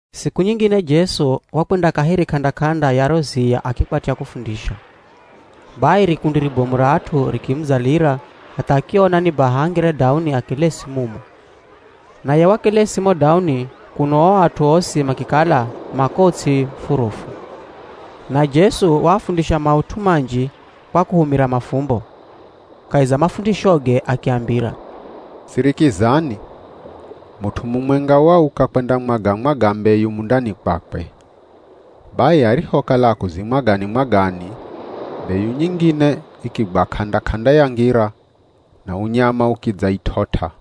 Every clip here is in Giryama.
Siku nyingine Jesu wakwenda kaheri k'anda-k'anda ya ro ziya akikwatya kufundisha. Bai rikundi ribomu ra at'u rikimudzalira hatha akiona ni baha angire dauni akelesi mumo. Naye wakelesi mo dauni kuno o at'u osi makikala ma ko ts'i furufu. Na Jesu waafundisha maut'u manji kwa kuhumira mafumbo. Kahi za mafundishoge akiambira, “Sirikizani! Mut'u mumwenga wauka kwendamwaga-mwaga mbeyu mundani kwakwe. Bai arihokala akuzimwagani-mwagani, mbeyu nyingine ikigwa k'anda-k'anda ya ngira na unyama ukidzait'ot'a.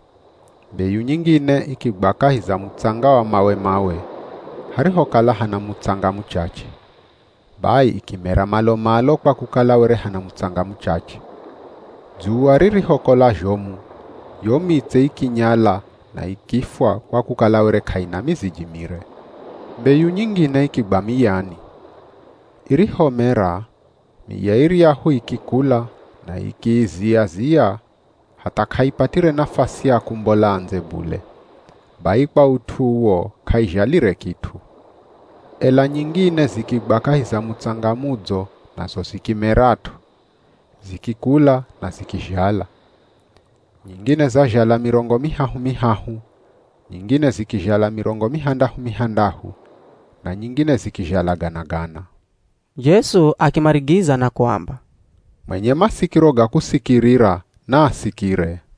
Mbeyu nyingine ikigwa kahi za mutsanga wa mawe-mawe, harihokala hana mutsanga muchache. Bai ikimera malo-malo kwa kukala were hana mutsanga muchache. Dzuwa ririhokola zhomu yo mitse ikinyala na ikifwa kwa kukala were k'aina miziji mire. Mbeyu nyingine ikigwa miyani. Irihomera, miya iryahu ikikula na ikiizia-zia hatha k'aipatire nafasi ya kumbola ndze bule, bai kwa ut'u uwo k'aizhalire kit'u. Ela nyingine zikigwa kahi za mutsanga mudzo nazo zikimerat'o, zikikula na zikizhala. Nyingine zazhala mirongo mihahu-mihahu, nyingine zikizhala mirongo mihandahu-mihandahu, na nyingine zikizhala gana-gana.” Jesu akimarigiza na kuamba, “Mwenye masikiro ga kusikirira, naasikire.”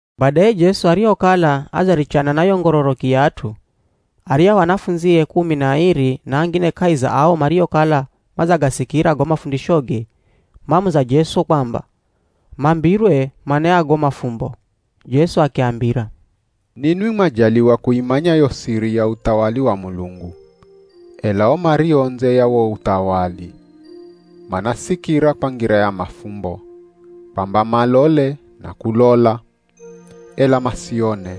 Badaye Jesu arihokala adzarichana na yo ngororoki ya at'u, aryahu anafundzie kumi na airi na angine kahi za ao mariokala madzagasikira go mafundishoge, mamuza Jesu kwamba mambirwe mana ya go mafumbo. Jesu akiambira, “Ninwi mwajaliwa kuimanya yo siri ya uthawali wa Mulungu. Ela o mario ndze ya wo uthawali, manasikira kwa ngira ya mafumbo, kwamba malole na kulola, ela masione,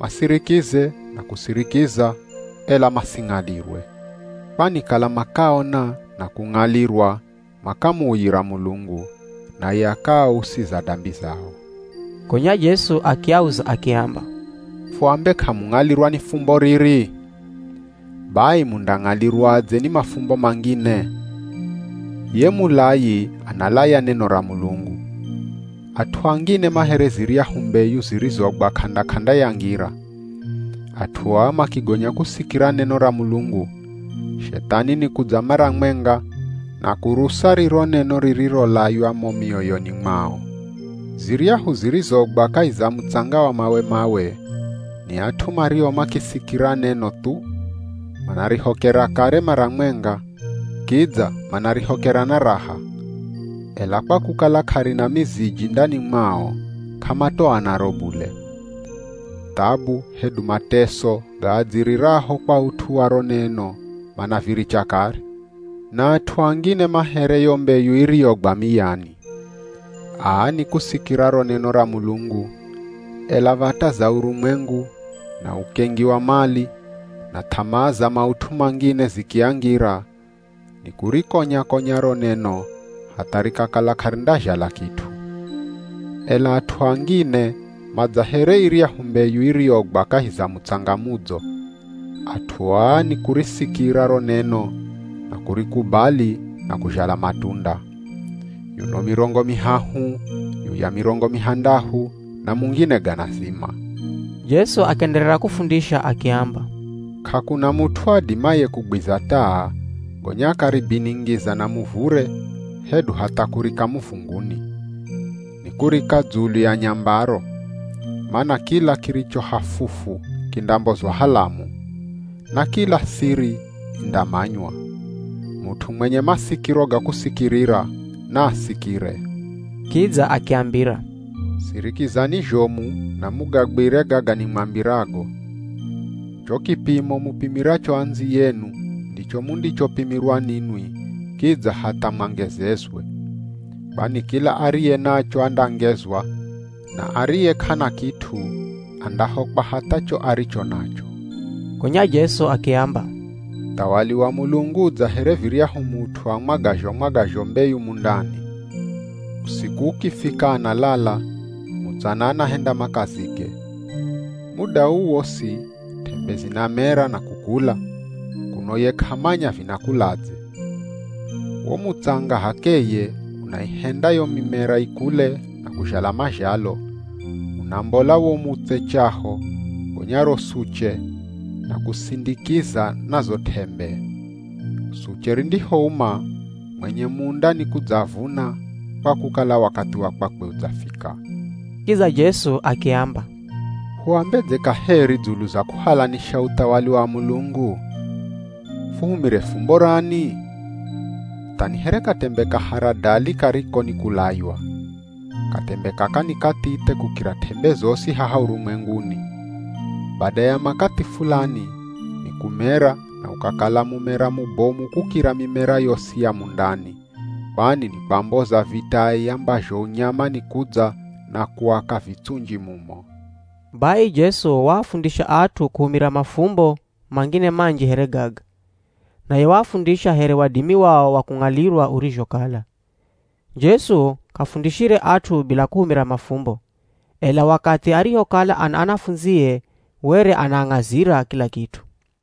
masirikize na kusirikiza, ela masing'alirwe. Kwani kala makaona na kung'alirwa makamuuyira Mulungu, naye akaausiza dambi zao.” Gonya Jesu akiauza akiamba, “Fuambe k'amung'alirwa ni fumbo riri? Bai mundang'alirwadze ni mafumbo mangine? Ye mulayi, analaya neno ra Mulungu. At'u angine ma here ziryahu mbeyu zirizogwa k'anda-k'anda ya ngira. At'u aa makigonya kusikira neno ra Mulungu, Shethani nikudza mara mwenga na kurusa riro neno ririrolaywa mo mioyoni mwao. Ziryahu zirizogwa kahi za mutsanga wa mawe-mawe, ni at'u mario makisikira neno thu, manarihokera kare mara mwenga, kidza manarihokera na raha. Ela kwa kukala k'arina miziji ndani mwao k'amatoa naro bule. Thabu hedu mateso gaadziriraho kwa ut'u wa ro neno manaviricha kare. Na at'u angine ma here yo mbeyu iriyogwa miyani. Aa ni kusikira ro neno ra Mulungu, ela v̱ata za urumwengu, na ukengi wa mali, na th'amaa za maut'u mangine zikiangira, nikurikonya-konya ro neno hatha rikakala k'arindazhala kit'u. Ela at'u angine ma dza here iryahu mbeyu iriyogwa kahi za mutsanga mudzo. At'u aa nikurisikira ro neno na kurikubali na kuzhala matunda. Yuno mirongo mihahu, yuya mirongo mihandahu na mungine gana zima.” Jesu akienderera kufundisha akiamba, “K'akuna mut'u adimaye kugwiza taa gonya akaribiningiza na muvure hedu hatha kurika muvunguni! Nikurika dzulu ya nyambaro. Mana kila kiricho hafufu kindambozwa halamu, na kila siri indamanywa. Mut'u mwenye masikiro ga kusikirira, naasikire.” Kidza akiambira, “Sirikizani zhomu na mugagwire gaga nimwambirago. Cho kipimo mupimiracho andziyenu ndicho mundichopimirwa ninwi, kidza hatha mwangezezwe. Kwani kila ariye nacho andangezwa, na ariye k'ana kit'u, andahokwa hatha cho aricho nacho.” Gonya Jesu akiamba, “Uthawali wa Mulungu u dza here viryahu mut'u amwagazho-mwagazho mbeyu mundani. Usiku ukifika analala, mutsana anahenda makazige. Muda uu wosi t'embe zinamera na kukula, kuno ye k'amanya vinakuladze. Wo mutsanga h'akeye unaihenda yo mimera ikule na kuzhala mazhalo, unambola wo mutse chaho, gonya ro suche, na kusindikiza na zo t'embe. Suche rindihouma, mwenye munda ni kudzavuna kwa kukala wakathi wa kwakwe udzafika.” Kidza Jesu akiamba, “Huambedze kaheri dzulu za kuhalanisha uthawali wa Mulungu? Fuhumire fumbo rani? Tha ni here katembe ka haradali kariko nikulaywa. Katembe kaka ni kathithe kukira t'embe zosi haha urumwenguni. Bada ya makathi fulani ni kumera na ukakala mumera mubomu kukira mimera yosi ya mundani, kwani ni kwamboza vitai ambazho unyama nikudza na kuaka vitsunji mumo.” Bai Jesu waafundisha at'u kuhumira mafumbo mangine manji here gaga. Naye waafundisha here wadimi wao wa kung'alirwa urizhokala. Jesu k'afundishire at'u bila kuhumira mafumbo, ela wakathi arihokala ana anafundzie were anaang'azira kila kit'u.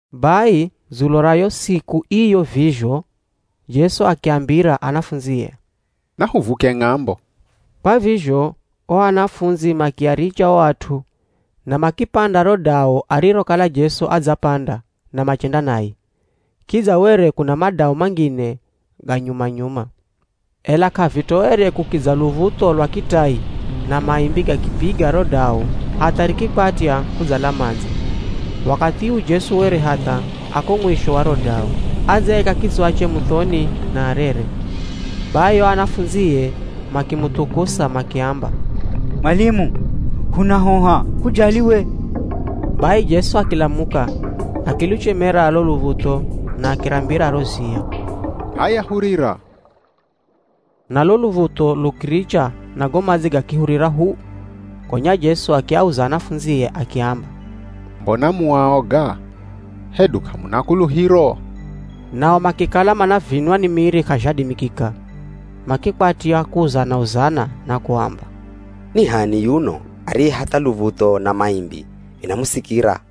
Bai dzulo ra yo siku iyo vizho Jesu akiambira anafundzie, “Nahuvuke ng'ambo.” Kwa vizho o anafundzi makiaricha o at'u, na makipanda ro dau arirokala Jesu adzapanda na machenda naye. Kidza were kuna madau mangine ga nyuma-nyuma. Ela k'avitoere kukidza luv̱utho lwa kitai na maimbi gakipiga ro dau hatha rikikwatya kudzala madzi. Wakathi uu Jesu were hatha a ko mwisho wa ro dau, adzaika kitswache muthoni na arere. Bai o anafundzie makimuthukusa makiamba, “Mwalimu, hunahoha, k'ujali we?” Bai Jesu akilamuka, akiluchemera lo luv̱utho na akirambira ro ziya, “H'aya hurira!” Na lo luv̱utho lukiricha na go madzi gakihurira hu. Gonya Jesu akiauza anafundzie akiamba, “Mbona mu aoga? Hedu k'amuna kuluhiro?” Nao makikala manavinwa ni miri k'azhadimikika. Makikwatya kuuzana-uzana na kuamba, “Ni h'ani yuno ariye hatha luv̱utho na maimbi vinamusikira?”